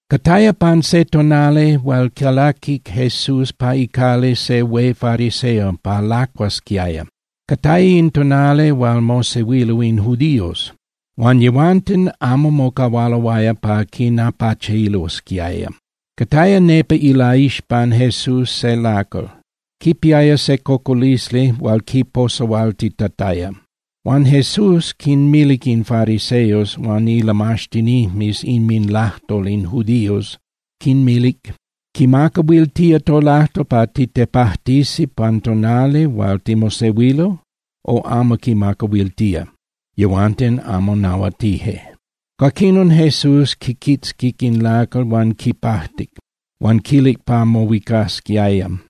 Cataya pan se tonali hual calaquic Jesús pa icali se hué fariseo pa lacuasquiaya, cataya in tonali hual mosehuilo in judíos. Huan yehuanten amo mocahualoaya pa quinapachilosquiaya. Cataya nepa ilaixpan Jesús se lacal, quipiaya se cocolisli hual quiposahualtitataya. Huan Jesús quinmilic in fariseos huan ilamaxtinijmes inminlajtol in judíos, quinmilic: —¿Quimacahuiltía tolajtol pa titepajtisi pan tonali hual timosehuilo, o amo quimacahuiltía? Yehuanten amo nahuatije. Cuaquinon Jesús quiquitzquic in lacal huan quipajtic huan quilic pa mohuicasquiaya.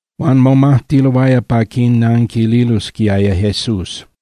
Huan momajtiloaya pa quinanquililosquiaya Jesús.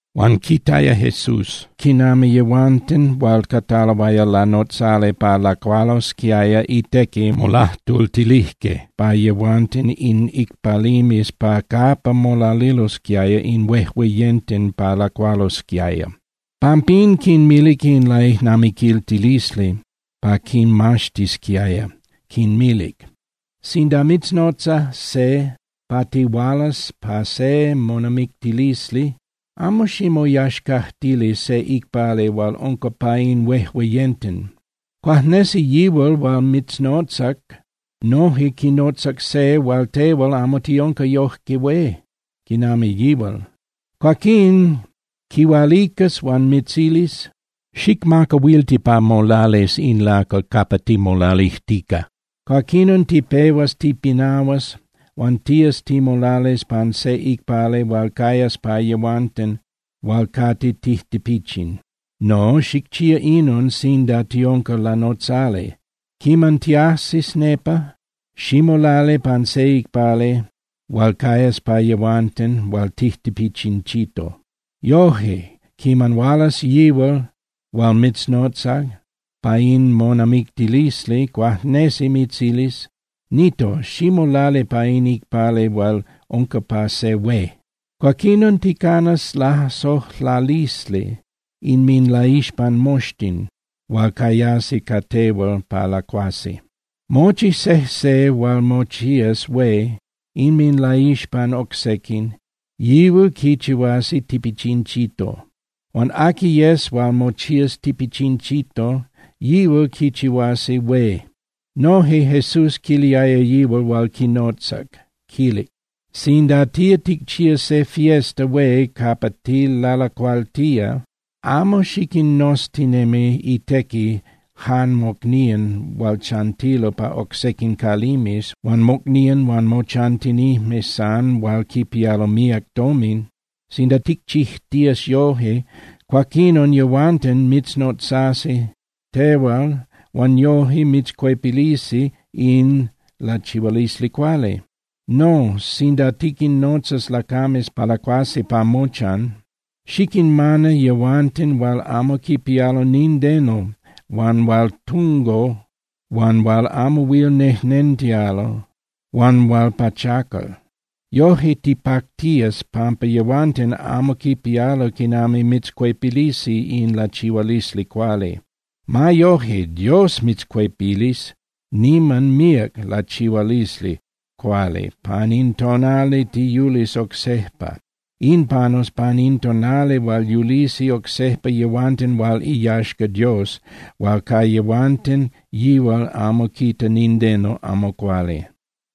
Huan quitaya Jesús quinami yehuanten hual cataloaya lanotzali pa lacualosquiaya itequi molajtultilijque pa yehuanten in icpalimes pa capa molalilosquiaya in huejueyenten pa lacualosquiaya. Pampín quinmilic in laijnamiquiltilisli pa quinmaxtisquiaya, quinmilic: —Sinda mitznotza se pa tihualas pa se monamictilisli, amo ximoyaxcajtili se icpali hual unca pa in huejueyenten. Cuajnesi yihual hual mitznotzac noje quinotzac se hual tehual amo tiunca yoje hué quinami yihual. Cuaquín quihualicas huan mitzilis: “Xicmacahuilti pa molalis in lacal capa timolalijtica.” Cuaquinon tipehuas tipinahuas huan tías timolalis pan se icpali hual cayas pa yehuanten hual cate tijtipichin. No, xicchía inon sinda tiunca lanotzali: Quiman tiajsis nepa, ximolali pan se icpali hual cayas pa yehuanten hual tijtipichinchito. Yoje, quiman hualas yihual hual mitznotzac pa in monamictilisli cuajnesi mitzilis: “Nito, ximolali pa in icpali hual unca pa se hué.” Cuaquinon, ticanas lasojlalisli inminlaixpan moxtin hual cayasi ca tehual pa lacuasi. Mochi sejse hual mochías hué inminlaixpan oc sequin, yihual quichihuasi tipichinchito. Huan aqui yes hual mochías tipichinchito, yihual quichihuasi hué. Noje Jesús quiliaya yihual hual quinotzac, quilic: —Sinda tía ticchía se fiesta hué capa tilalacualtía, amo xiquinnoztinemi itequi jan mocnían hual chantilo pa oc sequin calimes huan mocnían huan mochantinijmes san hual quipialo míac tomin. Sinda ticchijtías yoje, cuaquinon yehuanten mitznotzasi tehual huan yoje mitzcuepilisi in lachihualisli cuali. No, sinda tiquinnotzas lacames pa lacuasi pa mochan, xiquinmana yehuanten hual amo quipialo nindeno huan hual tungo huan hual amo huil nejnentialo huan hual pachacal. Yoje tipactías pampa yehuanten amo quipialo quinami mitzcuepilisi in lachihualisli cuali. Ma yoje, Dios mitzcuepilis niman míac lachihualisli cuali pan in tonali tiyulis oc sejpa. In panus pan in tonali hual yulisi oc sejpa yehuanten hual iyaxca Dios hual ca yehuanten yihual amo quita nindeno amo cuali.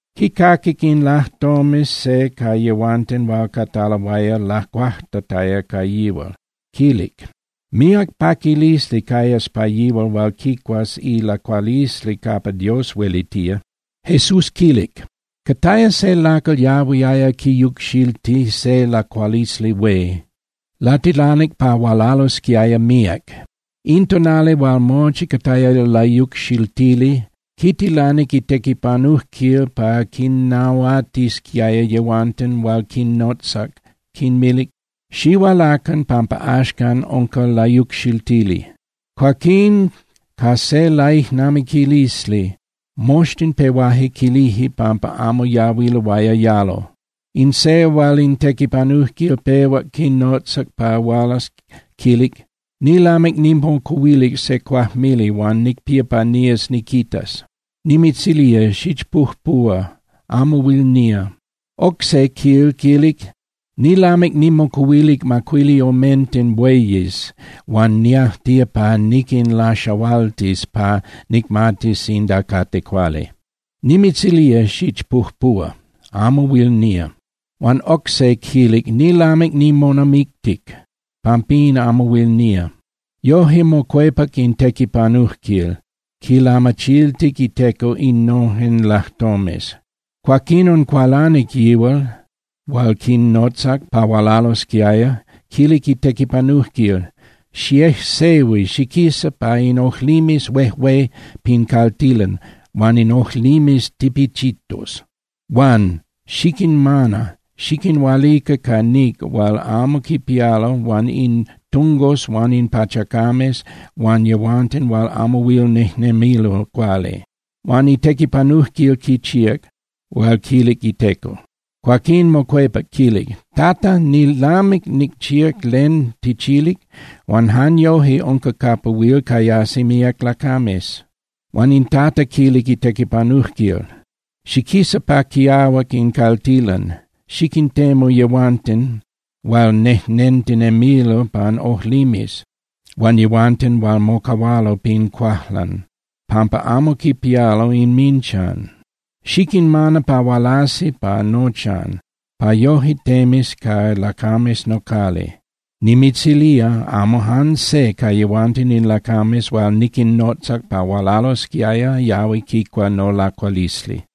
Quicaquic in lajtomes se ca yehuanten hual cataloaya lacuajtataya ca yihual, quilic: —Míac paquilisli cayas pa yihual hual quicuas ilacualisli capa Dios huelitía. Jesús quilic: —Cataya se lacal yahuiaya quiyucxilti se lacualisli hué. Latilanic pa hualalosquiaya míac. In tonali hual mochi cataya layucxiltili, quitilanic itequipanujquil pa quinnahuatisquiaya yehuanten hual quinnotzac, quinmilic: “Xihualacan pampa axcan unca layucxiltili.” Cuaquín ca se laijnamiquilisli moxtin pehuaje quilije pampa amo yahuiloaya yalo. In se hual in tequipanujquil pehuac quinotzac pa hualas quilic: “Nilamic nimocuhuilic se cuajmili huan nicpía pa nías niquitas. Nimitzilía xichpujpuhua, amo huil nía.” Oc se quil quilic: “Nilamic nimocuhuilic macuili omenten bueyes huan niajtía pa niquinlaxahualtis pa nicmatis sinda cate cuali. Nimitzilía xichpujpuhua, amo huil nía.” Huan oc se quilic: “Nilamic nimonamictic, pampín amo huil nía.” Yoje mocuepac in tequipanujquil, quilamachiltic iteco innojen lajtomes. Cuaquinon cualanic yihual hual quinnotzac pa hualalosquiaya, quilic itequipanujquil: “Xiejsehui xiquisa pa in ojlimes huejué pin caltilan huan in ojlimes tipichitos, huan xiquinmana xiquinhualica ca níc hual amo quipialo huan in tungos huan in pachacames huan yehuanten hual amo huil nejnemilo cuali.” Huan itequipanujquil quichíac hual quilic iteco. Cuaquín mocuepac quilic: “Tata, nilamic nicchíac len tichilic huan jan yoje unca capa huil cayasi míac lacames.” Huan in Tata quilic itequipanujquil: “Xiquisa pa quiahuac in caltilan, xiquintemu yehuanten hual nejnentinemilo pan ojlimes, huan yehuanten hual mocahualo pin cuajlan pampa amo quipialo inminchan. Xiquinmana pa hualasi pa nochan pa yoje temis ca lacames nocali. Nimitzilía, amo jan se ca yehuanten in lacames hual niquinnotzac pa hualalosquiaya yahui quicua nolacualisli.”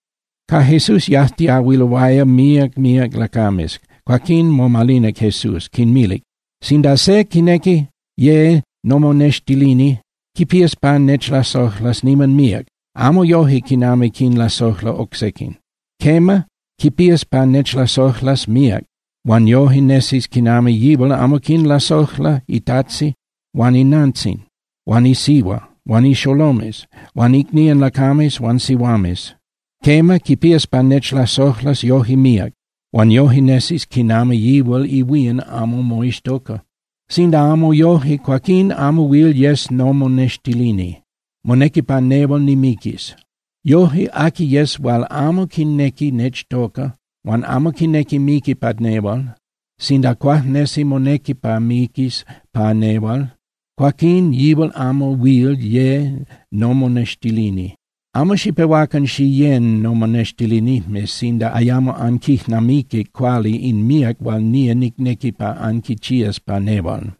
Ca Jesús yajtiahuiloaya míac míac lacames. Cuaquín momalinac Jesús, quinmilic: —Sinda se quinequi ye nomonextilini, quipías pa nechlasojlas niman míac, amo yoje quinami quinlasojla oc sequin. Quema, quipías pa nechlasojlas míac huan yoje nesis quinami yihual amo quinlasojla itajtzin huan inantzin huan isihua huan ixolomes huan icnían lacames huan sihuames. Quema, quipías pa nechlasojlas yoje míac, huan yoje nesis quinami yihual ihuían amo moixtoca. Sinda amo yoje, cuaquín amo huil yes nomonextilini. Monequi pa nehual nimiquis. Yoje, aqui yes hual amo quinequi nechtoca huan amo quinequi miqui pa nehual, sinda cuajnesi monequi pa miquis pa nehual, cuaquín yihual amo huil ye nomonextilini. Amo xipehuacan xiyén nomonextilinijmes sinda ayamo anquijnamiquic cuali in míac hual nía nicnequi pa anquichías pa nehual.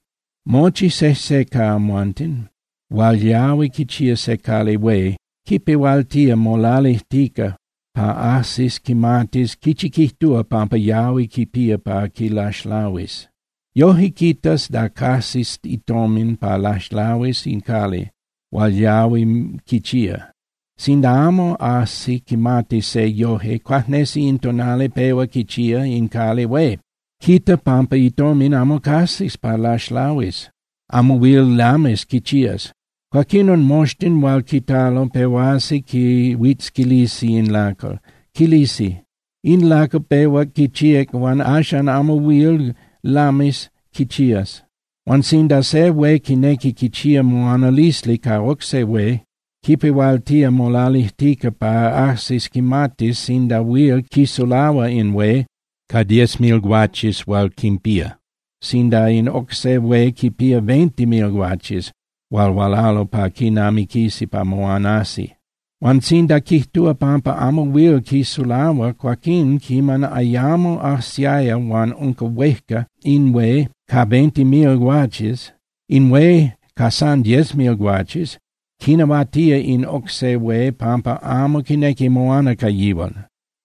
Mochi sejse ca amhuanten hual yahui quichía se cali hué, quipehualtía molalijtica pa ajsis quimatis quichi quijtúa pampa yahui quipía pa quilaxlahuis. Yoje quitas da cajsis itomin pa laxlahuis in cali hual yahui quichía. Sinda amo ajsi quimati se yoje, cuajnesi in tonali pehua quichía in cali hué, quita pampa itomin amo cajsis pa laxlahuis, amo huil lamis quichías. Cuaquinon moxtin hual quitalo pehuasi quihuitzquilisi in lacal. Quilisi: “In lacal pehuac quichíac huan axan amo huil lamis quichías.” Huan sinda se hué quinequi quichía moanalisli ca oc se hué, quipehualtía molalijtica pa ajsis quimatis sinda huil quisulahua in hué ca diez mil guaches hual quinpía, sinda in oc se hué quinpía veinte mil guaches hual hualalo pa quinamiquisi pa moanasi. Huan sinda quijtúa pampa amo huil quisulahua, cuaquín quiman ayamo ajsiaya huan unca huéjca in hué ca veinte mil guaches, in hué ca san diez mil guaches quinahuatía in oc se hué pampa amo quinequi moana ca yihual.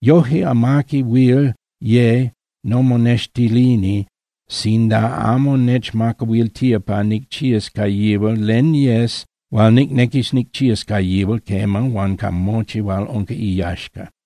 Yoje, amaqui huil ye nomonextilini sinda amo nechmacahuiltía pa nicchías ca yihual len yes hual nicnequis nicchías ca yihual, quema, huan ca mochi hual unca iyaxca.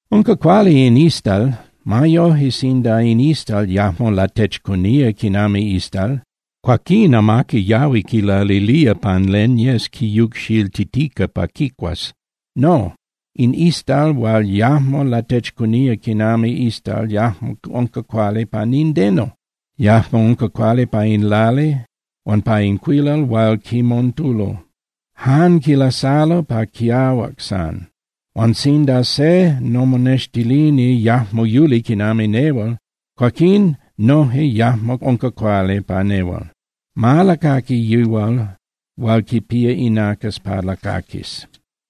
’Unca cuali in istal. Ma yoje, sinda in istal yajmo latechcunía quinami istal, cuaquín amaqui yahui quilalilía pan len yes quiyucxiltitica pa quicuas. No, in istal hual yajmo latechcunía quinami istal yajmo unca cuali pa nindeno, yajmo unca cuali pa in lali huan pa in cuilal hual quimontulo. Jan quilasalo pa quiahuac san. Huan sinda se nomonextilini yajmo yuli quinami nehual, cuaquín noje yajmo unca cuali pa nehual. Ma lacaqui yihual hual quipía inacas pa lacaquis.